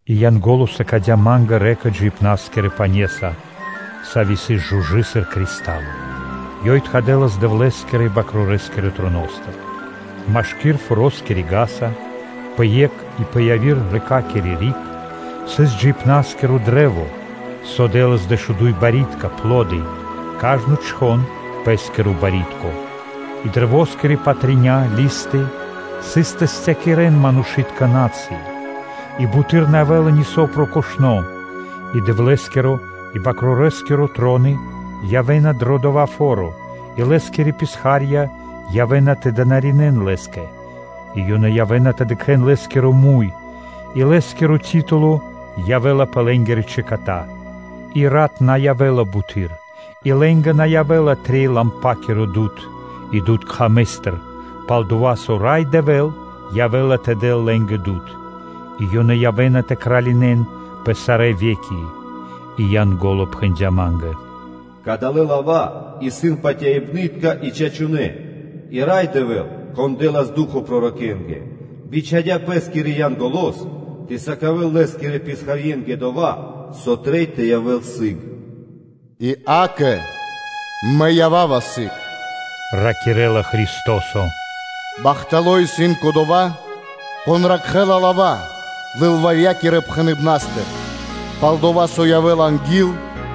И Янго́ло сыкадя́ ма́нгэ рэка (лэнь) джиибна́скирэ пане́са, сави́ сыс жужы, сыр кристало. Ёй тхадэлас Дэвлэ́скирэ и Бакрорэ́скирэ троно́стыр. Машкир форо́скири ґаса (вули́ца), пэ екх и пэ яви́р рэкакири (лэнякири) риг сыс джиибна́скиро кашт (дрэ́во), со дэ́лас дэшуду́й барьякирдэ́ (пло́ды), кажно чхон пэ́скиро барьякирдо́. И каштэ́скирэ патря́ (листы) сыс тэ састякирэн манушы́тка на́цыи (народы). И буты́р на явэ́ла нисо́ прокошно́. И Дэвлэ́скиро и Свэнтонэ́-Бакрорэскиро троно явэ́на дро дава́ фо́ро и Лэ́скирэ писха́рья явэ́на тэ дынаринэ́н Лэ́скэ, и ёнэ явэ́на тэ дыкхэ́н Лэ́скиро муй. И Лэ́скиро титуло явэ́ла пэ лэ́нгирэ чэката. И рат на явэ́ла буты́р и лэ́нгэ на явэ́ла трэй лампакиро дуд (свэ́то) и дуд кхамэстыр, пал-дова́ со Рай Дэвэ́л явэ́ла тэ дэл лэ́нгэ дуд. И ёнэ явэ́на тэ кралинэн пэ сарэ́ ве́ки. И Янго́ло пхэндя́ ма́нгэ: “Кадалэ́ лава́ исын патяибнытка и чачунэ́. И Рай Дэвэ́л, Кон дэ́лас ду́хо (фа́но) пророкэнгэ [свэнтонэ́-р.с.], бичхадя́ Лэ́скирэ Янголо́с тэ сыкавэ́л Лэ́скирэ писхарье́нгэ дова́, со трэй тэ явэ́л сыг. И, акэ, Мэ ява́ва сыгэс”, – ракирэ́ла Христо́со. “Бахтало́ исын кодова́, кон ракхэ́ла пророчытка лава́ лылварьякирэ пхэныбнастыр пал дова́, со явэ́ла анги́л.”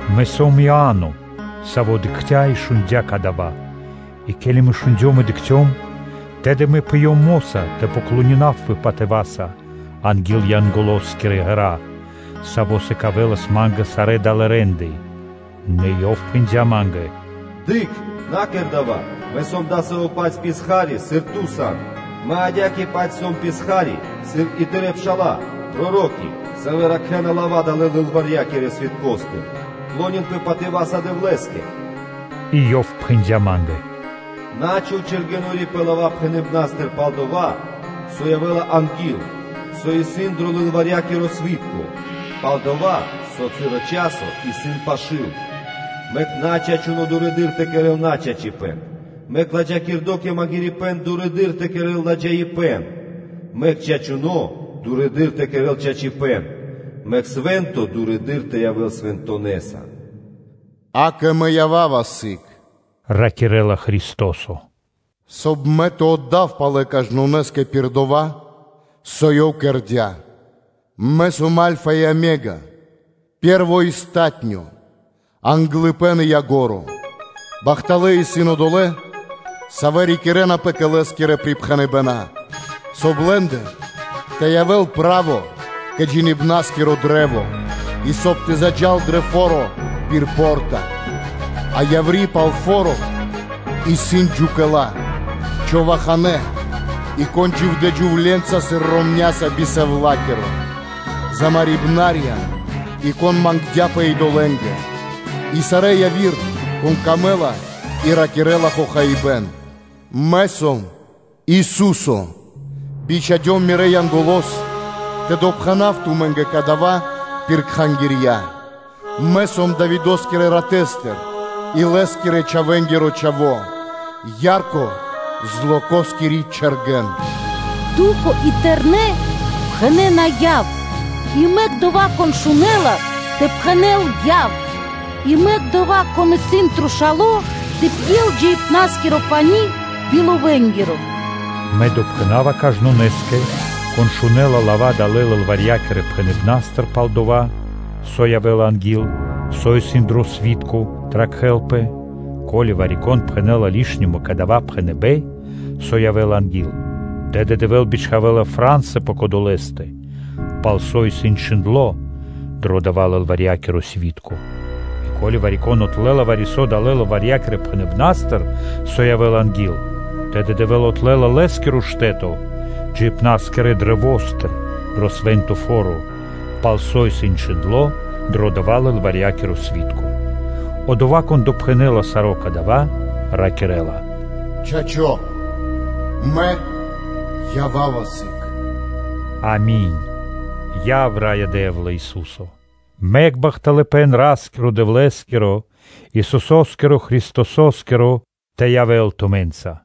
Мэ сом, Иа́но, саво́ дыкхця́ и шундя́ кадава́. И ке́ли мэ шундём и дыкхцём, тэды мэ пыём мо́са тэ поклонинавпэ патыва́са анги́л Янголоскирэ ґэра́, Саво́ сыкавэлас ма́нгэ сарэ́ далэ́ рэ́нды. Нэ ёв пхэндя́ ма́нгэ: “Дыкх! На кэр дава́! Мэ сом дасаво-паць писха́ри, сыр ту сан. Мэ адя́кэ-паць сом писха́ри, сыр и тырэ́ пша́ла, проро́ки, савэ́ ракхэна лава́ далэ́ лылварьякирэ свиткостыр: “Кэр шэрэ́са (клонинпэ) патыва́са Дэвлэ́скэ!” И ёв пхэндя́ ма́нгэ: “На́ чхув чэргэнори́ пэ лава́ пхэныбнастыр пал дова́, со явэ́ла анги́л (со исын дро лылварьякиро сви́тко), пал-дова́ со часо исын пашы́л. Мэк начачуно дурэды́р тэ кэрэ́л начачипэ́н, мэк ладжакирдо́ кэ магирибэн дурэды́р тэ кэрэ́л ладжаипэ́н. Мэк чачуно́ дурэды́р тэ кэрэ́л чачипэ́н; мэк свэ́нто дурэды́р тэ явэ́л Свэнтонэса.” “Акэ, Мэ ява́ва сы́гэс (ракирэ́ла Христо́со), – соб (кай) Мэ тэ отдав палэ кажнонэ́скэ пир дова́, со ёв кэрдя́. Мэ сом Альфа и Омега, Пэ́рво и Палатуно́, Англыпэ́н и Ко́нцо (Яго́ро). Бахталэ́ исын одолэ́, савэ́ рикирэнапэ кэ Лэ́скирэ припхэныбэна́, соб (кай) лэ́ндэ тэ явэ́л право кэ джиибна́скиро кашт (дрэ́во), и соб (кай) тэ заджа́л дро фо́ро пир по́рта. А яври́ пал фо́ро исын джукэла, човаханэ, и кон дживдя́ джувле́нца сыр ромня́са би сэвлакиро, замарибнарья, и кон мангдя́пэ идолэ́нгэ, и сарэ́ яви́р, конэ́скэ дава́ сыс пир ило́ тэ ракирэ́л хохаибэ́н. Мэ сом, Ису́со, бичхадём Мирэ́ Янголо́с тэ допхэнав тумэ́нгэ дава́ пир кхангирья. Мэ сом Давидо́скирэ ратэстыр и лэ́скирэ-чхавэ́нгиро чхаво́, ярко Злокоскири Чэргэн.” Ду́хо (Фа́но) и тэрны́ пхэнэ́на: “Яв!” И мэк о одова́, кон шунэ́ла, тэ пхэнэ́л: “Яв!” И мэк одова́, конэ́стэ исын смэ́га, тэ пьел джиибна́скиро пани́ би ловэнгиро. Мэ допхэнава кажнонэ́скэ, кон шунэ́ла лава́ далэ́ лылварьякирэ пхэныбнастыр пал дова́, со явэ́ла анги́л, со исын дро сви́тко тэ ракхэлпэ: ко́ли вари-кон пхэнэ́ла лишнима кэ дава́ пхэныбэ́н, со явэ́ла анги́л, тэды Дэвэ́л бичхавэ́ла фра́нсы пэ кодолэстэ, пал со исын чхиндло́ дро дава́ лылварьякиро сви́тко. И ко́ли вари-кон отлэла вари-со далэ́ лылварья́кирэ пхэныбна́стыр, со явэ́ла анги́л, тэды Дэвэ́л отлэла лэ́скиро штэ́то джиибна́скирэ каштэ́стыр (дрэвостыр) дро свэ́нто фо́ро, пал со исын чхиндло́ дро дава́ лылварья́киро сви́тко. Одова́, Кон допхэнэ́ла саро́ кадава́, ракирэ́ла: “Чачо́. Мэ ява́ва сыг.” Ами́нь. Яв, Раё Дэ́вла, Ису́со. Мэк бахталыпэ́н Ра́скирэ-Дэвлэ́скирэ, Исусо́скиро Христосо́скиро тэ явэ́л тумэ́нца.